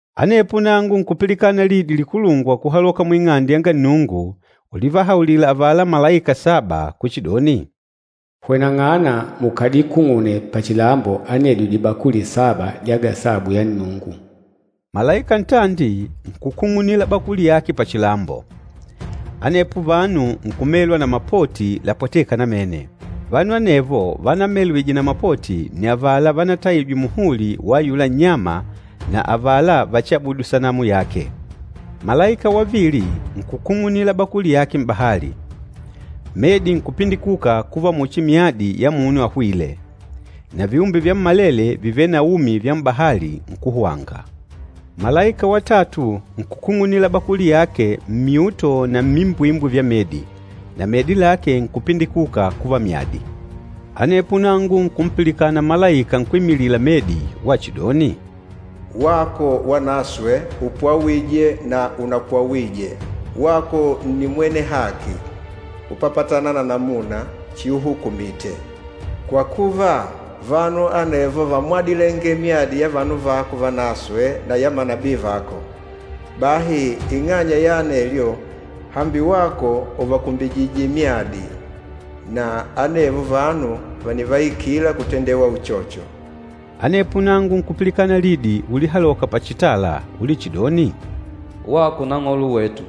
Anepo nangu nkupilikana lidi likulungwa kuhaloka mu Ing'ande yanga Nnungu ulivahaulila avala malaika saba kuchidoni, “Hweneng'ana mukadikung'une pachilambo anedyo dibakuli saba dya gasabu yanga Nnungu.” Malaika ntandi nkukung'unila bakuli yake pachilambo. Anepo vanu nkumelwa na mapoti lapwatêka namene. Vanu anevo vanamelwije na mapoti nni avala vanataijwe muhuli wa ayula nnyama na avala vachiabudu sanamu yake. Malaika wavili nkukung'unila bakuli yake m'bahali. Medi nkupindikuka kuva muchi myadi ya munu ahwîle, na viumbe vyammalele vivêle na umi vya m'bahali nkuhwanga. Malaika watatu nkukung'unila bakuli yake n'dihunde na n'dimbwimbwi dya medi, na medi lake nkupindikuka kuva myadi. Anepo nangu nkumpilikana malaika nkwímilila medi wachidoni, “Wako Wanaswe, upwawîje na unapwawije, wako nni mwene haki, kupapatana na namuna chiuhukumite. Kwa kuva, vanu anevo vámwadilenge myadi ya vanu vako vanaswe na ya manabii vako. Bahi ing'anya ya anelyo, hambi wako ùvakumbijije myadi, na anevo vanu vànivaikila kutendewa uchocho.” Anepo nangu nkupilikana lidi ulihaloka pachitala ulichidoni, “Wako Nang'olo wetu,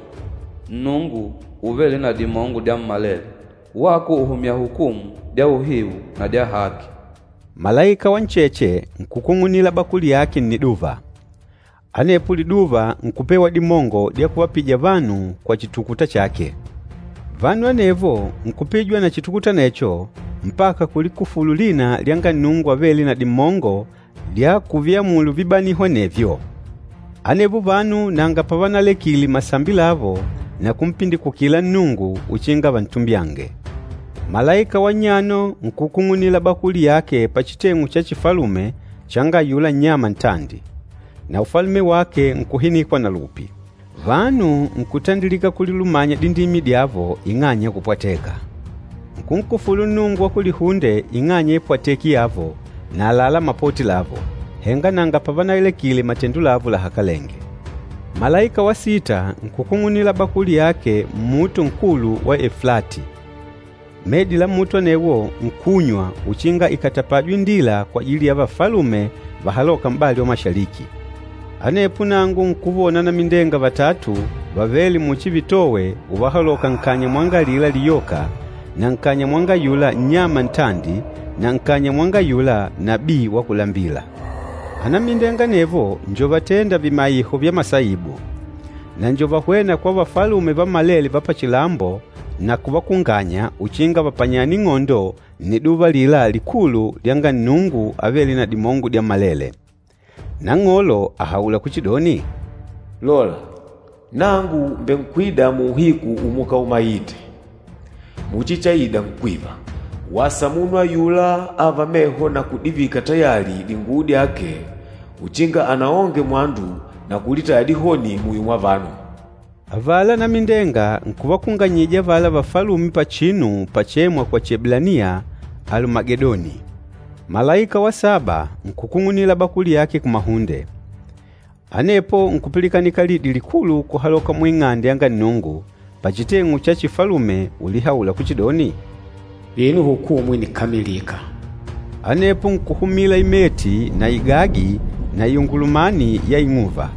Nnungu Uvêle na Dimongo Dyammalele, wako ùhumya hukumu dya uhiu na dya haki!” Malaika wa ncheche nkukung'unila bakuli yake nniduva. Anepo liduva nkupewa dimongo dya kuvapija vanu kwa chitukuta chake. Vanu anevo nkupijwa na chitukuta anecho mpaka kulikufulu lina lyanga Nnungu avêle na dimongo dya kuviamulu vibaniho anevyo. Anevo vanu nanga pavanalekile masambi lavo na kumpindikukila Nnungu uchinga vantumbyange. Malaika wa nnyano nkukung'unila bakuli yake pachiteng'u cha chifalume changa ayula nnyama ntandi, na ufalume wake nkuhinikwa na lupi. Vanu nkutandilika kulilumanya dindimi dyavo ing'anya ya kupwateka. Nkunkufulu Nnungu wa kulihunde ing'anya ya ipwateki yavo na àlalá mapoti lavo, henga nanga pavanalekile matendo lavo lahakalenge. Malaika wa sita nkukung'unila bakuli yake mmuto nkulu wa Eflati. Medi la muto anewo nkunywa uchinga ikatapajwe indila kwajili ya vafalume vahalôka m'bali wa kumanga. Anepo nangu nkuvona anamindenga vatatu vavêle muchi vitowe uvahaloka nkanya mwanga alila liyoka na nkanya mwanga ayula nnyama ntandi na nkanya mwanga ayula nabii wa kulambila. Anamindenga anevo njo vatênda vimaiho vya masaibu. Na njo vahwêna kwa vafalume vammalele va pachilambo na kuvakunganya uchinga vapanyane ing'ondo nniduva alila likulu lyanga Nnungu Avêle na Dimongo Dyammalele. Nang'olo àhaula kuchidoni, “Lola, nangu mbènkwida muuhiku umukaumaite muchi chaida nkwiva! Wasa munu ayula âva meho na kudivika tayali dinguwo dyake uchinga anaonge mwandu na kulitaya dihoni muyo mwa vanu.” Avala anamindenga nkuvakunganyija avala vafalume pachinu pachêmwa kwa Chieblaniya, Alumagedoni. Malaika wa saba nkukung'unila bakuli yake kumahunde. Anepo nkupilikanika lidi likulu kuhaloka mu Ing'ande yanga Nnungu, pachiteng'u cha chifalume ulihaula kuchidoni, “Vino hukumu ìnikamilika!” Anepo nkuhumila imeti na igagi na iungulumani ya ing'uva.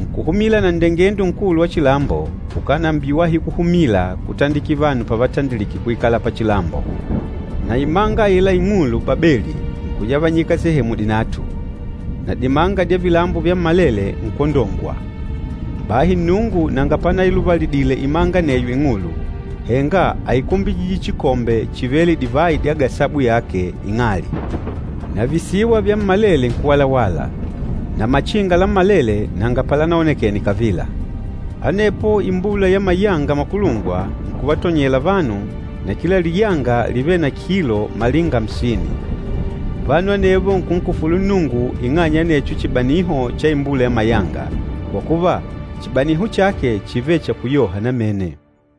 Nkuhumila na nndengendo nkulu wa chilambo ukánambiwahi kuhumila kutandikila vanu pavatandilike kuikala pachilambo. Na imanga aila ing'ulu Babeli nkuyavanyika sehemu dinatu, na dimanga dya vilambo vyammalele nkwondongwa. Bahi Nnungu nanga panailuvalidile imanga aneyo ing'ulu, henga áikumbijije chikombe chivêle divayi dya gasabu yake ing'ali. Na visiwa vyammalele nkuwalawala, na machinga lammalele nanga palanaonekene kavila. Anepo imbula ya mayanga makulungwa nkuvatonyela vanu, na kila liyanga lívele na kilo malinga amsini. Vanu anevo nkunkufulu Nnungu ing'anya ya anecho chibaniho cha imbula ya mayanga, kwa kuva, chibaniho chake chívele cha kuyoha namene.